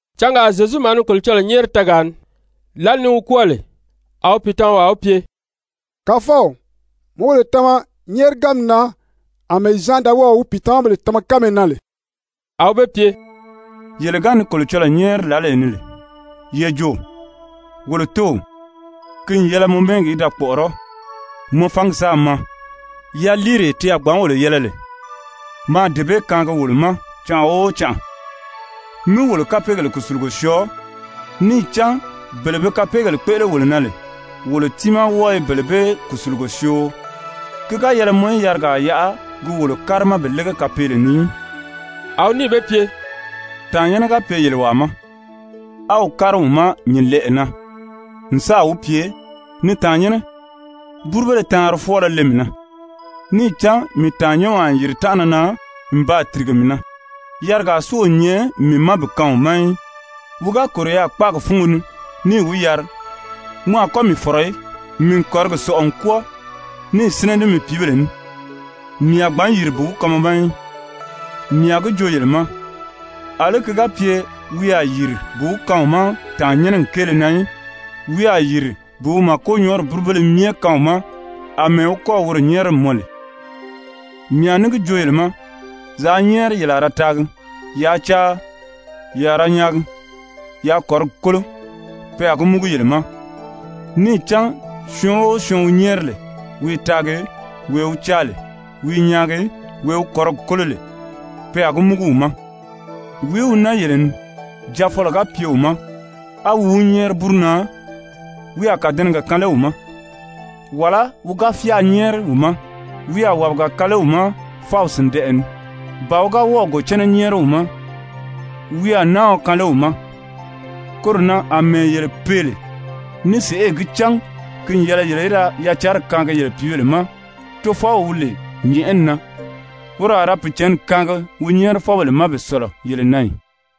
Cangaa Zyezu maa ni Kolocɔlɔɔ nyɛ́ɛri tɛɛgaa ni. Lǎli ni wi kwɔ́ɔ lè, a wi pìitamawaa wi pye: «Kàfɔw, mi wolo tama nyɛ́ɛriganmi na àmɛɛ Zyan da wɔ́ɔ̀ wi pìitamabèle tama kánmee na lè.» A wi be pye: «Yele ga ni Kolocɔlɔɔ nyɛ́ɛri lǎlee ni lè, ye jo: ‹Wolo Tóow! Ki n yɛlɛ mɔ mɛ́ɛgi í da kpɔ̀ʔɔrɔ́. Mɔ fangi sáā maa! Yaliiree ti a gbǎn wolo yɛlɛ lè, maa dee bee kaangi wolo ma canʔa o canʔa. Mí wolo kapeegèle kùsulugo syɔɔ, níì cán bele be kapeegèle kpéʔele wolo na lè, wolo tiimaa wɔ́ɔ i bele bee kùsulugo syoo. Ki ga yɛlɛ mɔ í yarigaa yaʔa gi wolo kárima bi lége kapeele ni í.›» A wi níì be pye: «Tàannyɛnnɛ ga pye yele wàa ma, á wi kári wi ma nyǐnlɛʔɛ na n sáà wi pye: ‹Ni tàannyɛnnɛ, búrubéle taanri fwɔ́ɔlɔ le mii na, níì cán mii tàannyɛnwaa n yìri tánʔana na n baa tìrige mii na, yarigaa si o nyɛ mii ma bi kaan wi ma í.› Wi ga kòro yaà kpáagi fúngo ni níì wi yari: ‹Mɔ a kɔ́ mii fɔ̀rɔ í, mii n kɔ̀rigi sɔ̀ʔɔ n kwɔ́ɔ, níì sínɛ ní mii pìíbèle ní, mii a gbǎn yìri bi wi kaan mɔ ma í,› mii a gi joo yele ma, àlí ki ga pye wi a yìri bi wi kaan wi ma tàannyɛnnɛgi kéele na í, wi a yìri bi wi màkonyɔɔri búrubéle myɛ kaan wi ma àmɛɛ wi kɔ́ɔ̀ woro nyɛ́ɛri n mɔn lè. Mii a ní gi joo yele ma, yaa nyɛ́ɛri, ye a ra taagi. Yaa caa, ye a ra nyaagi. Yaa kɔ̀rigi kólo, pe a gi múgu yele ma. Níì cán syɔɔn o syɔɔn wi nyɛ́ɛri lè, wi i taagi, wee wi caa lè, wi i nyaagi, wee wi kɔ̀rigi kólo lè, pe a gi múgu wi ma. Wìí wi naa yele ni, jaafɔlɔ ga pye wi ma á wi wi nyɛ́ɛri búru na, wi a kàdɛnɛgɛ kaan lé wi ma? Wàlá wi ga fyáā nyɛ́ɛri wi ma, wi a wàbiga kaan lé wi ma fáw sìndɛʔɛ ni? Ba wi ga wɔ́ɔ̀ gòcɛnnɛ nyɛ́ɛri wi ma, wi a náaɔ kaan lé wi ma? Koro na àmɛɛ yele pee lè ní sèʔê gi cán ki n yɛlɛ yele í da yacanri kaangi yele pìíbèle ma, Tofɔw wi lè nyɛ̀ʔɛni na, woro a ra Pìicǎnni kaangi wi nyɛ́ɛrifɔbèle ma bi sɔ̀lɔ yele na ì?»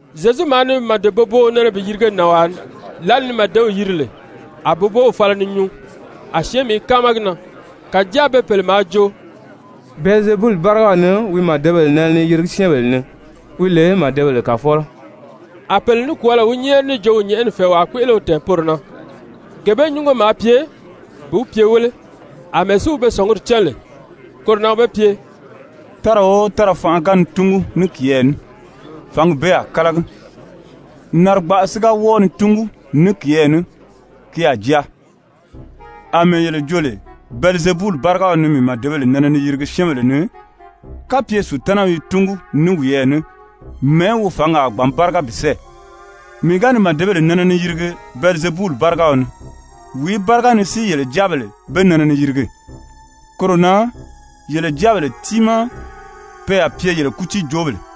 Zyezu maa ni màde-boboo nɛnɛ bi yirige nànwaa ni. Lǎli ni màdew yiri lè, a boboow fala ni nyuu, a syɛ́ɛnmi i káama gi na. Kàjáa be pèle maa jo: «Bɛlizebuli bárigaw ni wi màdebèle nɛnɛ ni yirigi syɛ́ɛnbèle ni, wi lè màdebèle kàfɔlɔ A pèle nikwɔɔlɔ wi nyɛ́ɛri níì jo wi nyɛ̀ʔɛni fɛ̀ɛwaa kpéʔele wi tɛ̀ɛn poro na, gee bee nyúngo maa pye bi wi pye wéle. Amɛɛ si wi be sɔ̀nguri cán lè, koro na wi be pye: «Tára o tára fanʔa ga ni túngu ní kiyɛɛ ní, fǎngi bee a kálagi, narigbaʔa si ga wɔ́ɔ ni túngu ní kiyɛɛ ní, ki a jaa. Amɛɛ yele jo lè Bɛlizebuli bárigaw ni mii màdebèle nɛnɛ ni yirigi syɛ́ɛnbèle ni, kapye Sutanaw i túngu ní wiyɛɛ ní, mɛ̀ɛ́ wi fǎngi a gbǎn báriga bi sɛ́ɛ? Mii ga ni màdebèle nɛnɛ ni yirigi Bɛlizebuli bárigaw ni, wìí báriga ni si yele jáabèle be nɛnɛ ni yirigi? Koro na yele jáabèle timaa pe a pye yele kútiijoobèle.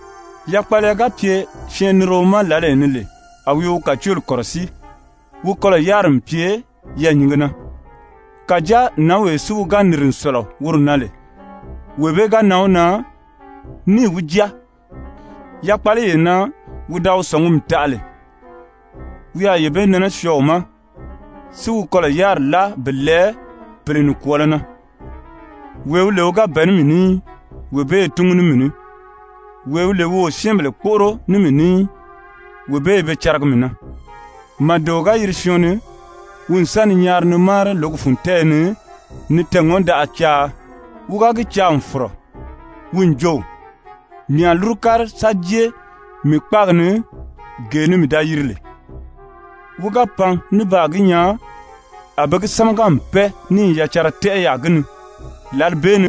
Yakpaliya ga pye syɛɛnnirio ma lǎlee ni lè a wi i wi kàcooli kɔ̀rɔsíi, wi kɔlɔ̀ yáriri n pye yɛɛ̀nyinge na. Kàjáa nǎnwee si wi ga nìri n sɔ̀lɔ woro na lè, wee bee ga nan wi na níì wi jáa, yakpaliyee na wi da wi sɔ̀ngumi taʔa lè, wi a yee bee nɛnɛ syɔɔ wi ma, si wi kɔlɔ̀ yáriri láa bi lɛɛ pèle nikwɔɔlɔ na. Wee wi lè wi ga bɛ̀ɛ ní mii ní í, wee bee i túngu ní mii ní. Wee wi lè wi o syɛ́ɛnbèle kpóʔoro ní mii ní í, wee bee i be caragi mii na. «Màdeo ga yiri syɔɔn ni, wi n sa ni nyaari ni máari lǒgi fun tɛ́ɛyɛ ni, ni tɛɛ̀ŋɔndaʔa caa. Wi ga gi caa n fɔ̀rɔ, wi n jo: ‹Mii a lúru kári sa jée mii kpáagi ni, gee ni mii da yiri lè.› Wi ga pan ní baa gi nyaa a be gi sámaga n pɛ́ɛ níì yacanra tɛ́ʔɛ yaà gi ni, lǎli bee ni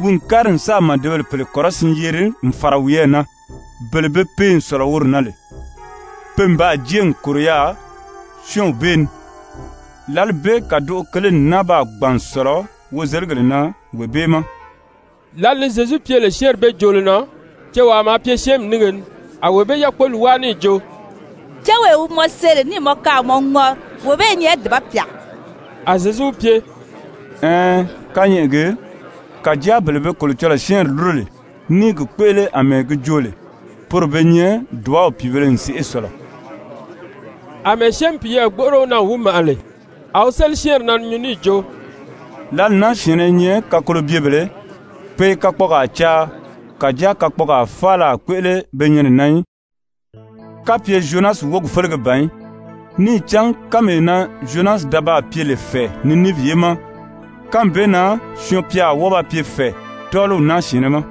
wi n kári n sáà màdebèle pèle kɔrɔsiin yeri n fàra wiyɛɛ na, bele be pee n sɔ̀lɔ woro na lè. Pe n baa jée n kòro yaà syɔ́ɔnw bee ni, lǎli bee kàdoʔo kele n náa baa gbàn n sɔ̀lɔ wozeligèle na wee bee ma.» Lǎli ni Zyezu pye lè syɛ́ɛnri bee joolo na, cewaa maa pye syɛ́ɛnmi nínge ni, a wee bee yákpoli wáa níì jo: «Céwee wi mɔ see lè níì mɔ kaan a mɔ ŋɔri, wee bee i nyɛ dùba pyà.» A Zyezu wi pye: «Ɛɛn, kányɛʔɛ gii, kàjáa bele be Kolocɔlɔɔ syɛ́ɛnri lúro lè ní i gi kpéʔele àmɛɛ gi jo lè, poro be nyɛ dùbaw pìibēle n sèʔê sɔ̀lɔ.» Amɛɛ syɛ́ɛnmi piyɛɛ gbóʔoro wi na n wi màʔa lè, a wi séli syɛ́ɛnri na ni nyuu níì jo: «Lǎli naa syɛ̀ɛnnɛ i nyɛ kakolobyebèlē. Pe i kakpɔɔgaa caa, kàjáa kakpɔɔgaa faala a kpéʔele be nyɛnɛ na í, kapye Zyonasi wógi félege ban í. Níì cán kánmee na Zyonasi da baa pye lè fɛ̀ɛ Niniivi ye ma, kánmi bee na Syɔɔn-pya a wɔ́ɔ ba pye fɛ̀ɛ tɔ́ɔliw naa syɛ̀ɛnnɛ ma.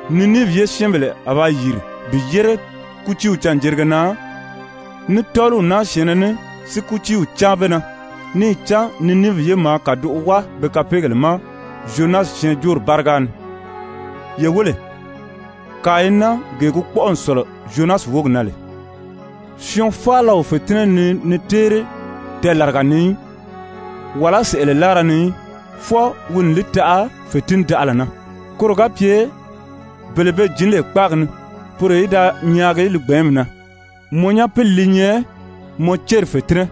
Niniivi ye syɛ́ɛnbèle a ba yìri bi yére kútiiw canjerige na ní tɔ́ɔliw naa syɛ̀ɛnnɛ ní si kútiiw cáan be na, níì cán Niniivi ye maa kàdoʔo wáa be kapeegèle ma Zyonasi syɛɛnjóori báriga ni. Ye wéle, kàa i naa, gee gi kpɔ́ʔɔ n sɔ̀lɔ Zyonasi wógi na lè. «Syɔɔn faala o fètinnɛ nii ni téeri tɛɛlaraga ni í, wàlá sɛ̀ʔɛlɛ láara ni í, fwɔɔ wi a li taʔa fètindaʔala na, koro ga pye bele be jǐn lè kpáagi ni, poro í da nyaagi li gbɛ̀ɛ́nmi na. Mɔ nyapili li nyɛ mɔ céri fètinnɛ.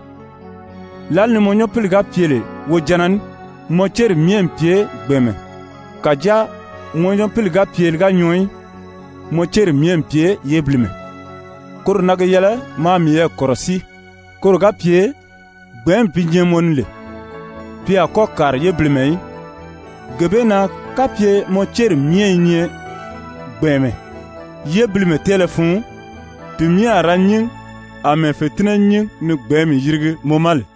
Lǎli ni mɔ nyapili ga pye lè wojanna ní, mɔ céri myɛ n pye gbɛ̀ɛnmɛ. Kàjáa mɔ nyapili ga pye li ga nyɔɔ í, mɔ céri myɛ n pye yébilimɛ. Koro na gi yɛlɛ maa miyɛɛ kɔ̀rɔsíi koro ga pye gbɛ̀ɛ́nmi bi nyɛ mɔ ni lè, pi a kɔ́ kàri yébilimɛ í. Gee bee na kapye mɔ céri myɛ i nyɛ gbɛ̀ɛnmɛ, yébilimɛ tɛ́ɛlɛ fun, ti myɛ a ra nyín àmɛɛ fètinnɛ nyín ni gbɛ̀ɛ́nmi yirigi mɔ ma lè.»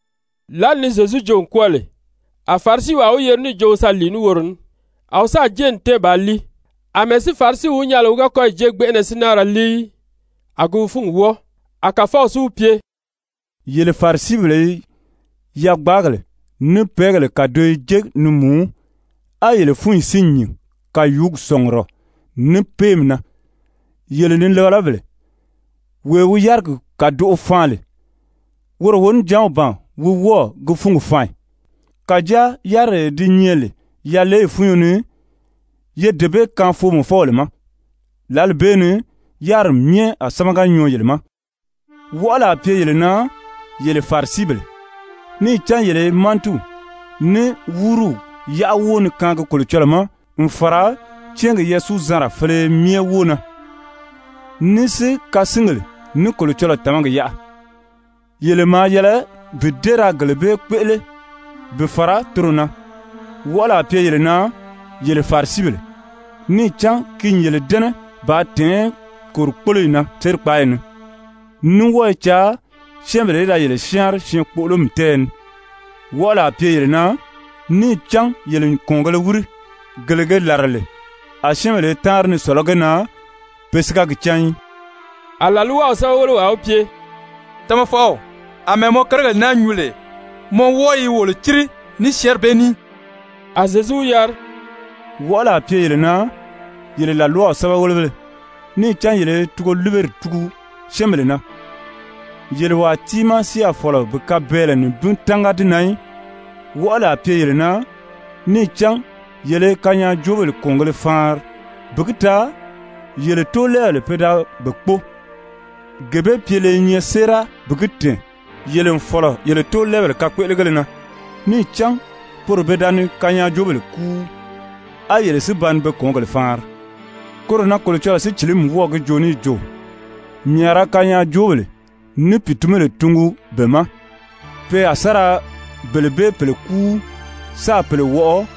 Lǎli ni Zyezu joo n kwɔ́ɔ lè, a Farisiwaa wi yeri níì jo wi sa lìi ní woro ní. A wi sáà jée n tɛ́ɛn bàā líi. Amɛɛ si Farisiw wi nyaa lè wi ga kɔ́yi jée gbɛnʔɛnɛ si náa ra líi í, a gi wi fúngi wɔ́ɔ. A Kàfɔw si wi pye: «Yele Farisibèle i yagbaagèle ní pɛ́ɛgèle kàdoyo jé ni mùú, á yele fúnyi si nyìn kàyuugi sɔ̀ngurɔ ní péemi na. Yele nilabalabèle, wee wi yárigi kàdoʔo faan lè, woro wonijanw ban wi wɔ́ɔ̀ gi fúngi faan ì? Kàjáa yáriree di nyɛ lè yaleyi fúnyo ni, ye dee bee kaan foomɔfɔbèle ma, lǎli bee ni yáriri myɛ a sámaga nyɔɔ yele ma. Wɔʔɔli a pye yele na, yele Farisibèle! Níì cán yele i mantiw ní wuruw wuruw: Mantiw ní wuruw i nyɛ Zyefubèle cɛnʔɛ yárira. yáʔa wóo ni kaangi Kolocɔlɔɔ ma, n fàra cɛ́ɛngi yasuuzanra féleye myɛ wóo na, ní si kasingèle ní Kolocɔlɔɔ tàmagi yaʔa, yele maa yɛlɛ bi dée ra gele bee kpéʔele bi fàra toro na. Wɔʔɔli a pye yele na, yele Farisibèle! Níì cán ki n yele dɛ́nɛ bàā tɛ̀ɛ́n kòrikpoloyi na sérikpaayi ni, ní wɔ́ɔ i caa syɛ́ɛnbèle í da yele syáanri syɛɛn-kpoʔolomi tɛ́ɛyɛ ni. Wɔʔɔli a pye yele na! Níì cán yele n kɔ̀ɔngēle wíri, gele ge làra lè a syɛ́ɛnbèle i táanri ni sɔ̀lɔ́ ge na, pe si ga gi cán í.» A làlwaw sɛ́bɛwelewaa wi pye: «Tamafɔw, àmɛɛ mɔ kérigèle naa nyuu lè, mɔ wɔ́ɔ i wolo círi ní syɛ́ɛnri bee ní.» A Zyezu wi yari: «Wɔʔɔli a pye yele na, yele làlwaw sɛ́bɛwelebéle! Níì cán yele i tugoliberi tugu syɛ́ɛnbèle na, yele wàa tiimaa si a fɔ̀lɔ bi kabɛɛlɛ nibin tánga di na í. Wɔʔɔli a pye yele na! Níì cán yele i kanyaajoobèle kɔ̀ɔngēle faanri, bi gi taa yele tóolɛɛbèle pe da be kpóo. Gee bee pyele i nyɛ séera bi gi tɛ̀ɛn yele n fɔ̀lɔ yele tóolɛɛbèle kakpéʔelegéle na. Níì cán poro pe da ni kanyaajoobèle kúu, á yele si ba ni be kɔ̀ɔngèle faanri. Koro na Kolocɔlɔɔ Sícilimi wɔ́ɔ̀ gi joo níì jo: ‹Mii a ra kanyaajoobéle ní pìitunbéle tungu be ma. Pe a sa ra bele bee pèle kúu, sáā pèle wɔʔɔ.›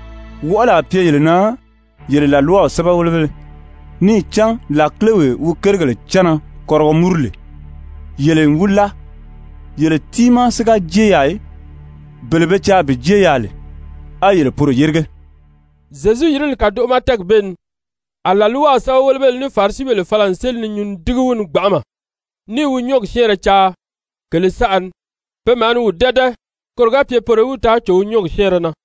Wɔʔɔli a pye yele na, yele làlwaw sɛ́bɛwelebéle, níì cán làkilewee wi kérigèle cánna kɔrigɔ múru lè, yele n wi láa. Yele tiimaa si ga jée yaà í, bele be caa bi jée yaà lè, á yele poro yérige.» Zyezu yirili kàdoʔo ma tɛ́ɛgi bee ni, a làlwaw sɛ́bɛwelebéle ní Farisibèle fala n séli ni nyuu ni dígi wi ni gbanʔama, ní i wi nyɔ́ɔgi syɛ́ɛnrɛ caa kèlē saʔa ni. Pe maa ni wi dɛ́dɛ koro ga pye poro í wi taa cò wi nyɔ́ɔgi syɛ́ɛnrɛ na.